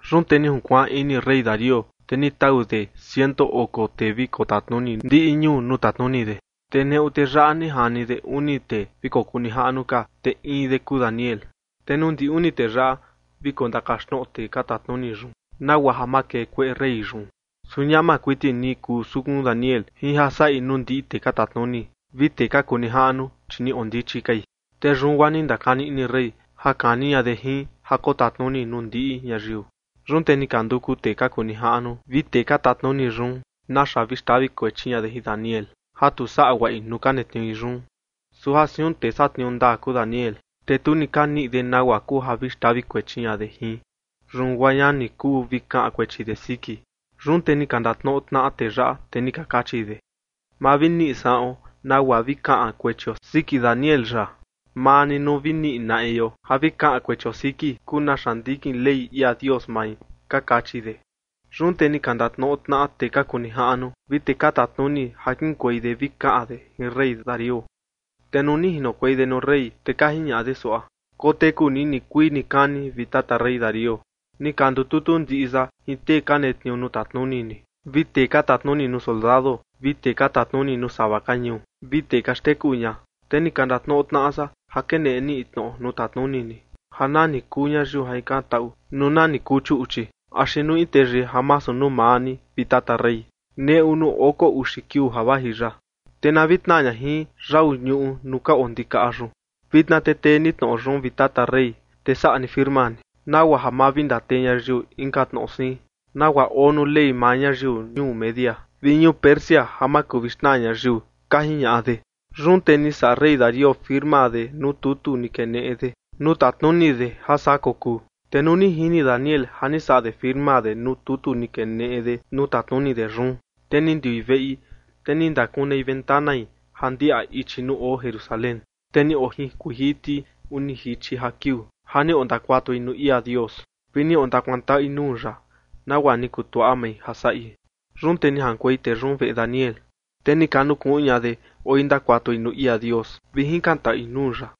Yun te ni junkuaan ini rey Darío, te ni tau de ciento oko tee vi kotatnuni ndiꞌi ñuu nuu tatnuni de. Te neꞌu tee yaꞌa ni jani de uni tee vi kokuu nijaꞌnu ka, te in de kuu Daniel. Te nuu ndi uni tee yaꞌa vi kondakaxtnoꞌo tee ka tatnuni yun nagua ja ma kee kueꞌe rey yun. Su ñama kuiti ni kuu sukun Daniel jin ja saꞌi nuu ndiꞌi tee ka tatnuni vi tee ka kuu nijaꞌnu, chi ni oo ndichi kai. Te yun guaa ni ndakani ini rey ja kani ña de jin ja kotatnuni nuu ndiꞌi ñayiu. Yun te ni ka nduku tee ka kuu nijaꞌnu vi tee ka tatnuni yun naxa vi xtavi kuechi ña de jin Daniel ja tu saꞌa guaꞌi nuu ka netniui yun. Su ja siun tee satniuu ndaa kuu Daniel, te tu ni ka niꞌi de nagua kuu ja vi xtavi kuechi ña de jin. Yun guaa ña ni kuu vi kaꞌan kuechi de siki. Yun te ni ka ndatnoꞌo tnaꞌa tee yaꞌa, te ni ka kachi de: ―Ma vi niꞌi saꞌuon nagua vi kaꞌan kuechio siki Daniel yaꞌa, maa ni nuu vi niꞌi naꞌio ja vi kaꞌan kuechio siki kuu naxa ndikin Ley ia Dios mai ―ka kachi de. Yun te ni ka ndatnoꞌo tnaꞌa tee ka kuu nijaꞌnu vi tee ka tatnuni ja kiꞌinkuei de vi kaꞌan de jin rey Darío. Te nuu ni jinokuei de nuu rey, te ka jiñaꞌa de suaꞌa: ―Koteku ni nikuii nikani, vi tata rey Darío. Ni ka ndututu ndiꞌi san jin tee ka netniuu nuu tatnuni ni, vi tee ka tatnuni nuu soldado, vi tee ka tatnuni nuu sava ka ñuu, vi tee ka xteku ña, te ni ka ndatnoꞌo tnaꞌa san ja keneꞌe ni in tnoꞌo nuu tatnuni ni ja nani kuu ñayiu ja jikantaꞌu nuu nani kuu chuꞌchi axi nuu in teyii ja masu nuu maa ni, vi tata rey, neꞌu nuu oko uxi kiuu ja vaji yaꞌa, te na vi tnaa ña jin yau ñuꞌu nuu ka oo ndikaꞌa yun. Vitna te tee ni tnoꞌo yun, vi tata rey, te saꞌa ni firma ni, nagua ja ma vi ndatee ñayiu inka tnoꞌo siin, nagua oo nuu ley maa ñayiu ñuu Media vi ñuu Persia ja ma kuu vi xnaa ñayiu ―ka jiñaꞌa de. Yun te ni saꞌa rey Darío firma de nuu tutu ni keneꞌe de nuu tatnuni de ja saa kokuu. Te nuu ni jini Daniel ja ni saꞌa de firma de nuu tutu ni keneꞌe de nuu tatnuni de yun, te ni ndiui veꞌi, te ni ndakunei ventanai ja ndiaꞌa ichi nuu oo Jerusalén, te ni ojinkuiin jiti uni jichi ja kiuu ja ni ondakuatui nuu ia Dios, vi ni ondakuantaꞌui nuu ya, nagua ni kutuaꞌa mai ja saꞌi. Yun te ni jaꞌankuei tee yun veꞌe Daniel, te ni ka nukuꞌun ña de, oi ndakuatui nuu ia Dios vi jikantaꞌui nuu ya.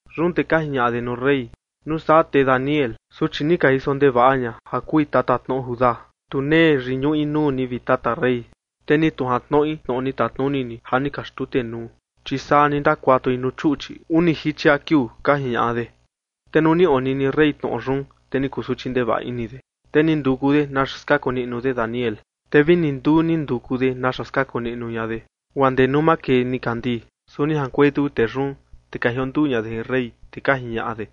Yun te ka jiñaꞌa de nuu rey: ―Nuu saa, te Daniel, suchi ni ka jiso ndevaꞌa ña ja kui tatatnoꞌo Judá, tu nee yiñuꞌi nuu ni, vi tata rey, te ni tu jantnoꞌi tnoꞌo ni tatnuni ni ja ni ka xtutenuu, chi saa ni ndakuatui nuu chuꞌchi uni jichi ja kiuu ―ka jiñaꞌa de. Te nuu ni onini rey tnoꞌo yun, te ni kusuchi ndevaꞌa ini de, te ni nduku de naxa skaku niꞌnu de Daniel. Te vi ni nduu ni nduku de naxa skaku niꞌnu ña de, guaa ndee nuu makee nikandii. Su ni jaꞌankuei tuku tee yun, te ni ka jionduu ña de jin rey, te ka jiñaꞌa de: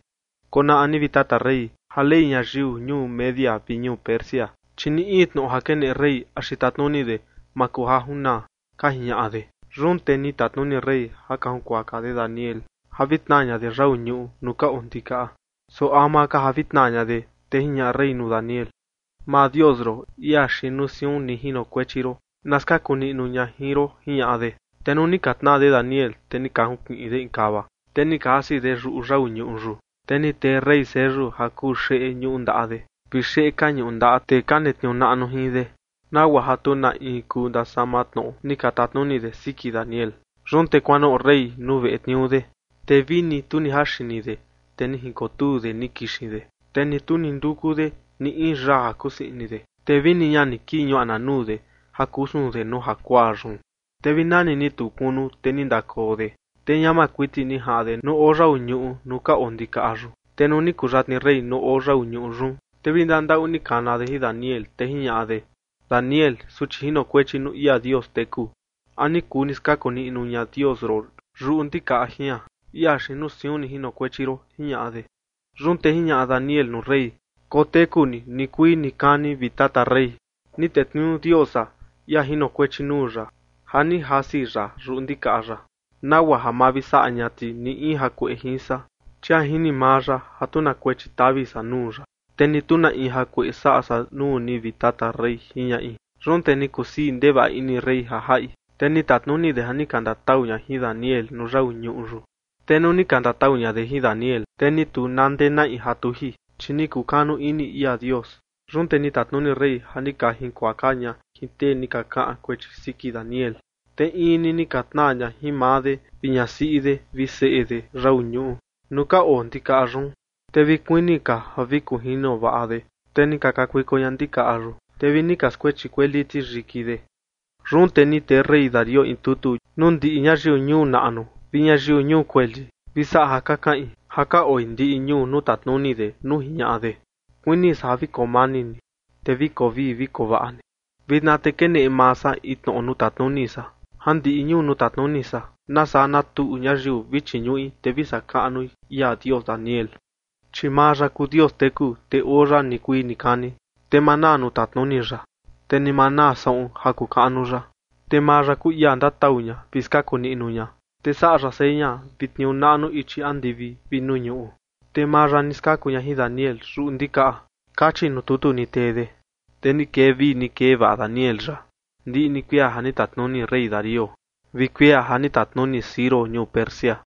―Konaꞌa ni, vi tata rey, ja ley ñayiu ñuu Media vi ñuu Persia, chi ni in tnoꞌo ja keneꞌe rey axi tatnuni de, ma kuu ja junaa ―ka jiñaꞌa de. Yun te ni tatnuni rey ja ka junkuaka de Daniel ja vi tnaa ña de yau ñuꞌu nuu ka oo ndikaꞌa. Su ama ka ja vi tnaa ña de, te jiñaꞌa rey nuu Daniel: ―Maa Dios ron, ia xiin nuu siun ni jinokuechi ron, na skaku niꞌnu ña jin ron ―jiñaꞌa de. Te nuu ni ka tnaa de Daniel, te ni ka junkiꞌin de in kava, te ni ka jasi de yuꞌu yau ñuꞌu yun, te ni tee rey seyu ja kuu xeꞌe ñuꞌu ndaꞌa de, vi xeꞌe ka ñuꞌu ndaꞌa tee ka netniuu naꞌnu jin de, nagua ja tu na in kuu ndasama tnoꞌo ni ka tatnuni de siki Daniel. Yun te kuanoꞌo rey nuu veꞌe tniuu de, te vini tu ni jaa xini de, te ni jinkotuu de ni kixin de, te ni tu ni nduku de ni in yaa ja kusii ini de, te vini ña ni kii ñuaꞌna nuu de ja kusun de nuu jakuaa yun. Te vi nani ni tuu kunu, te ni ndakoo de, te ñama kuiti ni jaꞌan de nuu oo yau ñuꞌu nuu ka oo ndikaꞌa yun. Te nuu ni kuyatni rey nuu oo yau ñuꞌu yun, te vi ndandaꞌu ni kana de jin Daniel, te jiñaꞌa de: ―Daniel, suchi jinokuechi nuu ia Dios teku, ¿a ni kuu ni skaku niꞌnu ña Dios ron yuꞌu ndikaꞌa jian, ia xiin nuu siun ni jinokuechi ron? ―jiñaꞌa de. Yun te jiñaꞌa Daniel nuu rey: ―Koteku ni nikuii nikani, vi tata rey. Ni tetniuu Dios san, ia jinokuechi nuu ya, ja ni jasi ya yuꞌu ndikaꞌa yaꞌa, nagua ja ma vi saꞌa ña ti ni in jakueꞌe jin san, chi ja jini maa ya ja tu na kuechi tavi san nuu ya, te ni tu na in jakueꞌe saꞌa san nuu ni, vi tata rey ―jiñaꞌi. Yun te ni kusii ndevaꞌa ini rey ja jaꞌi, te ni tatnuni de ja ni ka ndatau ña jin Daniel nuu yau ñuꞌu yun. Te nuu ni ka ndatau ña de jin Daniel, te ni tu na ndee naꞌi ja tuji, chi ni kukanu ini ia Dios. Yun te ni tatnuni rey ja ni ka jinkuaka ña jin tee ni ka kaꞌan kuechi siki Daniel, te in ni ni ka tnaa ña jin maa de vi ñasiꞌi de vi seꞌe de yau ñuꞌu nuu ka oo ndikaꞌa yun. Te vi kuini ka ja vi kunjino vaꞌa de, te ni ka kakuiko ña ndikaꞌa yun, te vi ni ka skuechi kueli ti yiki de. Yun te ni tee rey Darío in tutu nuu ndiꞌi ñayiu ñuu naꞌnu vi ñayiu ñuu kueli vi saꞌan ja ka kaꞌin ja ka oi ndiꞌi ñuu nuu tatnuni de nuu jiñaꞌa de: ―Kuini san ja vi koo mani ni, te vi koo vii vi koo vaꞌa ni. Vitna te keneꞌe maa san in tnoꞌo nuu tatnuni san, ja ndiꞌi ñuu nuu tatnuni san na saa na tuꞌu ñayiu vi chiñuꞌi, te vi saꞌa kaꞌnui ia Dios Daniel. Chi maa ya kuu Dios teku, te oo ya nikuii nikani, te ma naa nuu tatnuni ya, te ni ma naa saꞌun ja kuu kaꞌnu ya. Te maa ya kuu ia ndatau ña vi skaku niꞌnu ña, te saꞌa ya seña vi tniuu naꞌnu ichi andivi vi nuu ñuꞌu, te maa ya ni skaku ña jin Daniel yuꞌu ndikaꞌa. Kachi nuu tutu ni tee de. Te ni kee vii ni kee vaꞌa Daniel yaꞌa ndiꞌi ni kuia ja ni tatnuni rey Darío vi kuia ja ni tatnuni Ciro ñuu Persia.